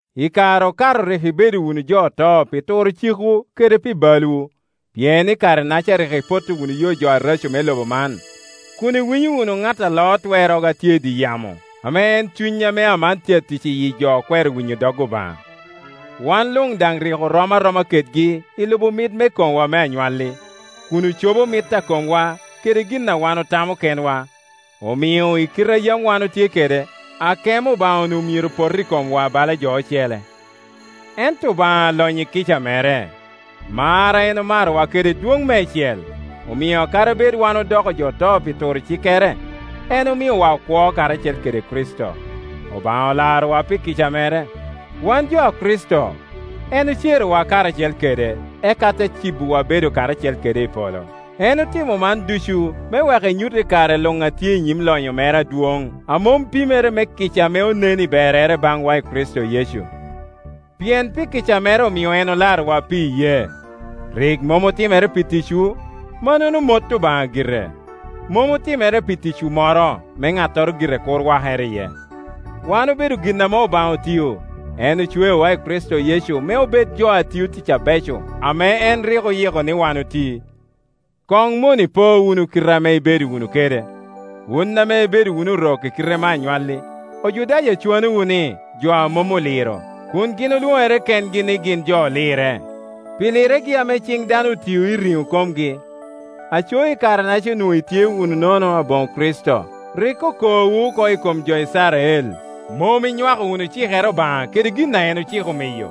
Ikare okato rik ibedo wunu jo oto pi turo cikwu kede pi balwu; pien i kare-naca rik ipotto wunu yo areco me lobo man, kun iwinyo wunu ŋat a loo twerrogo a tye i dye yamo, ame en cuny ame aman tye atic iyi jo a kwero winyo dog Obaŋa. Wan luŋ daŋ rik orom aroma kedgi i lubo mit me komwa me anywalli, kun ocobo mit a komwa kede gin a wan otamo kenwa; omio i kite a yam wan otye kede, akemo Obaŋa onwoŋo myero pot i komwa bala jo ocele. Ento Obaŋa alonyo i kica mere, mar a en omarowa kede dwoŋ meicel, omio kadi bed wan odoko jo oto pi turo cikkere, en omiowa okwo karacel kede Kricito. Obaŋa olarowu pi kica mere. Wan jo a Kricito, en ocerowa karacel kede, eka te cibowa bedo karacel kede i polo. En otimo man ducu me wek enyut i kare luŋ a tye i nyim lonyo mere adwoŋ a mom pimere me kica ame onen i berrere baŋwa i Kricito Yecu. Pien pi kica mere omio en olarowa, pi iyee. Rik mom otimere pi ticwu; mannono mot Obaŋa gire. Mom otimere pi ticwu moro, me ŋattoro gire kur wakere iye. Wan obedo gin ame Obaŋa otio; en ocweowa i Kricito Yecu me obed jo a tio tic abeco ame en rik oyiko ni wan oti. Koŋ mono ipo wunu kite ame ibedo wunu kede, wun ame ibedo wunu Orok i kite me anywalli, Ojudaya cwanowu ni, jo a mom oliro, kun gin olwoŋere kengi ni gin jo olirre, pi lirregi ame ciŋ dano otio i riŋo komgi. Aco i kare-naca onwoŋo itye wunu nono aboŋo Kricito, rik okoowu oko i kom jo Icrael, mom inywako wunu cikere Obaŋa kede gin a en ociko miyo.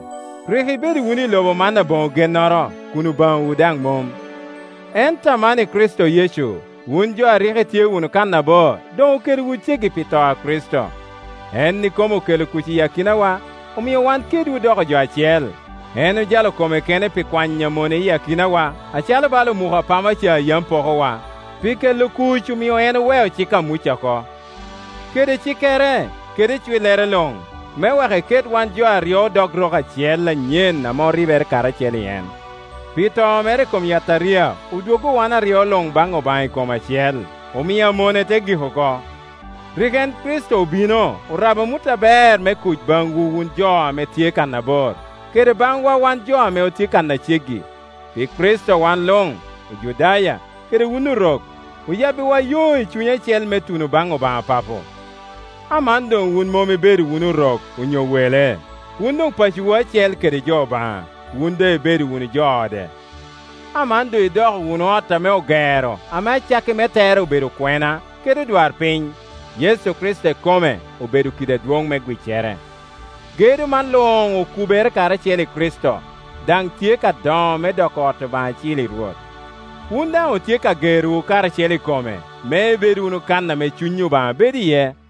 Rik ibedo wunu i lobo man aboŋo gennoro, kun Obaŋawu daŋ mom. Ento aman i Kricito Yecu, wun jo a rik itye wunu kannabor doŋ okelowu ceggi pi to a Kricito. En ikome okelo kuc i akinawa, omio wan kedwu odoko jo acel; en ojalo kome kene pi kwanyo amone iyi akinawa acalo bala omuko apama ca a yam pokowa. Pi kelo kuc omio en oweo cik a Muca oko, kede cikkere, kede icwillere luŋ, me wek eket wan jo aryo odok rok acel anyen ame oribere karacel i en. Pi to mere i kom yataria odwoggo wan aryo luŋ baŋ Obaŋa i kom acel, omio amone te gik oko. Rik en Kricito obino orabo amut aber me kuc baŋwu wun jo ame tye kannabor, kede baŋwa wan jo ame tye kan a ceggi. Pi Kricito wan luŋ, Ojudaya kede wun Orok, oyabbiwa yo i cuny acel me tuno baŋ Obaŋa Papo. Aman doŋ wun mom ibedo wunu orok onyo wele; wun doŋ pacowu acel kede jo Obaŋa, wun doŋ ibedo wunu jo ode. Aman doŋ idoko wunu ot ame ogero, ame acakki me tere obedo okwena kede odwarpiny. Yecu Kricito ikome obedo kidi adwoŋ me gwiccere. Gedo man luŋ okubere karacel i Kricito, daŋ tye ka doŋo me doko ot Obaŋa acil i Rwot. Wun daŋ otye ka gerowu karacel i kome, me ibed wunu kan ame Cuny Obaŋa bedo iye.